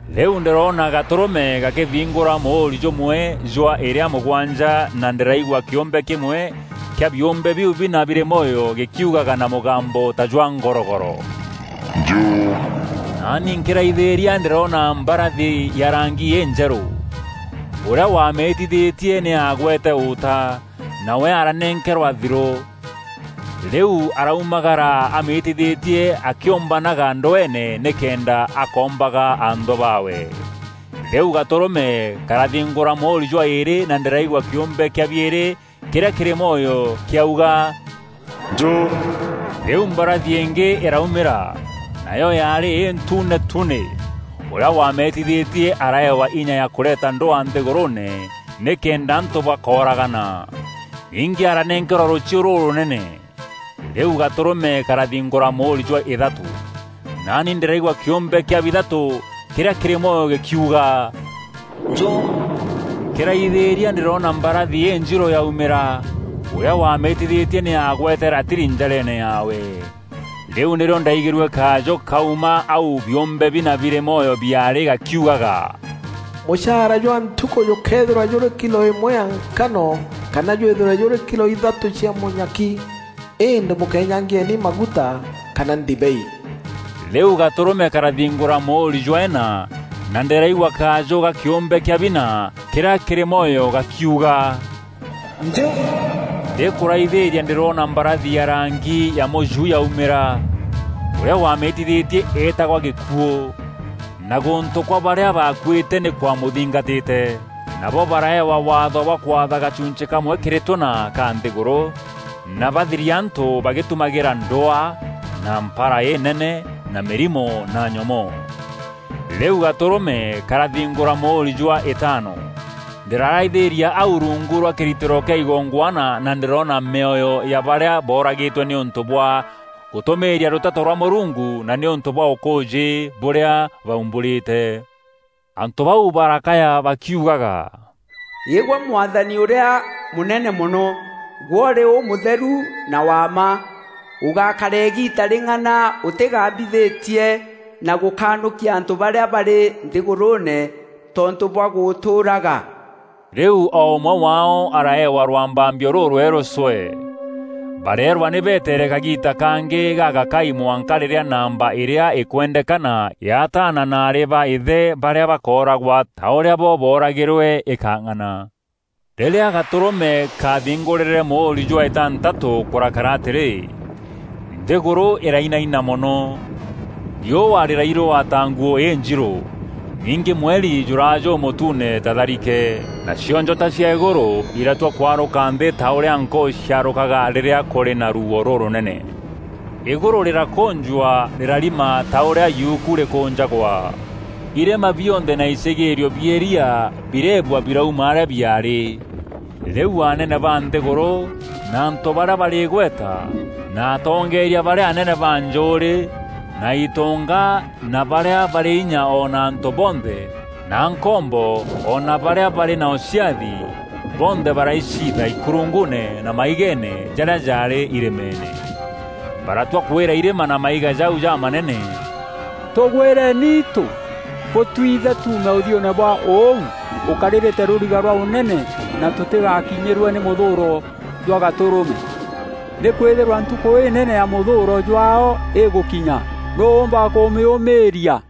Rîu ndîroona Gatûrûme gakîthingûra mûûri jûmwe jwa îrîa mûgwanja na ndîraigua kîûmbe kîmwe kîa biûmbe biu bina birî mwoyo gîkiugaga na mûgambo ta jwa ngorogoro, “Njû!” Naani nkîraithîîria ndîroona mbarathi ya rangi înjerû. Ûrîa wamîîtithîtie nî aagwete ûta, nawe aranenkerwa thirû. Rîu araumagara amîîtithîtie akîûmbanaga ndweene nîkenda akoombaga anthû baawe. Rîu Gatûrûme karathingûra mûûri jwa îîrî na ndîraigua kîûmbe kîa biîrî kîrîa kîrî mwoyo kîauga, “Njû!” Rîu mbarathi ingî îraumîra, nayo yaarî întuune tunî. Ûrîa wamîîtithîtie araewa inya ya kûreeta ndwaa nthîgûrûûne nîkenda antû bakooragana. Ningî aranenkerwa rûchiû rûrûnene. Rîu Gatûrûme karathingûra mûûri jwa îthatû. Naani ndîraigua kîûmbe kîa bithatû kîrîa kîrî mwoyo gîkiuga, “Njû!” Nkîraithîîria ndîroona mbarathi înjirû yaumîra. Ûrîa wamîîtithîtie nî aagwete ratiri njareene yaawe. Rîu nîrîo ndaaigîrue kajû kuuma au biûmbe bina birî mwoyo biaarî gakiugaga, “Mûchaara jwa ntukû jûkeethîrwa jûrî kilo îmwe ya nkano kana jwîthîrwe jûrî kilo ithatû cia mûnyaki. Îndî bûkeenyangieni maguta kana ndibei!” Rîu Gatûrûme karathingûra mûûri jwa îna na ndîraigua kajû ga kîûmbe kîa bina kîrîa kîrî mwoyo gakiuga, “Njû!” Ndîkûraithîîria ndîroona mbarathi ya rangi ya mûju yaumîra. Ûrîa wamîîtithîtie eetagwa Gîkuû, na Gûntû kwa barîa bakuîte nî kwamûthingatîte. Nabo baraewa waatho bwa kwatha gachunchî kamwe kîrî tûna ka nthîgûrû na bathirie antû bagîtumagîra ndwaa na mpara înene na mîrimo na nyomoo. Rîu Gatûrûme karathingûra mûûri jwa îtaano. Ndîraraithîîria au rungu rwa kîritîro kîa igongwana na ndîroona mîoyo ya barîa booragîtwe nîûntû bwa gûtûmîîria rûteto rwa Mûrungu na nîûntû bwa ûkûûjî bûrîa baumbûrîte. Antû bau barakaya bakiugaga, “Îgwe Mwathani ûrîa mûnene mono, gwe ûrî ûmûtheru na wa mma! Ûgakara îgiita rîng'ana ûtîgambithîtie na gûkanûkia antû barîa barî nthîgûrûûne tontû bwa gûtûûraga?” Rîu o ûmwe waao araeewa rwambambio rûrwerû cwee. Bareerwa nî beteere kagiita kangî gagakai mwanka rîrîa namba îrîa îkwendekana ya ataana na aarî ba îthe barîa bakooragwa ta ûrîa bo booragîrwe îkang'ana. Rîrîa Gatûrûme kaathingûrîre mûûri jwa îtantatû kûrakara atîrî, Nthîgûrû îrainaina mono. Riûa rîrairûwa ta nguû înjirû. Ningî mweri jûraa jûmûtuune ta tharike. Nacio njota cia îgûrû iratua kwarûka nthî ta ûrîa nkûû ciarûkaga rîrîa kûrî na ruuo rûrûnene. Îgûrû rîrakûnjwa rîrarima ta ûrîa yuku rîkûnjagwa. Irîma bionthe na icîgîîrio bia îria birebua birauma arîa biaarî. Rîu anene ba nthîgûrû na antû barîa barî îgweta na atongeeria barîa anene ba njûûrî na itonga na barîa barî inya o na antû bonthe na nkombo o na barîa barî na ûciathi, bonthe baraiciitha ikurunguune na maigeene jarîa jaarî irîmeene. Baratua kwîra irîma na maiga jau jamanene, “Tûgwîreni itû, bûtwiithe tuume ûthiûûne bwa ûu ûkarîrîte rûriga rwa ûnene na tûtîgakinyîrwe nî mûthûûro jwa Gatûrûme. Nîkwîthîrwa ntukû înene ya mûthûûro jwaao îgûkinya, nûû ûûmba kûmîûmîîria?”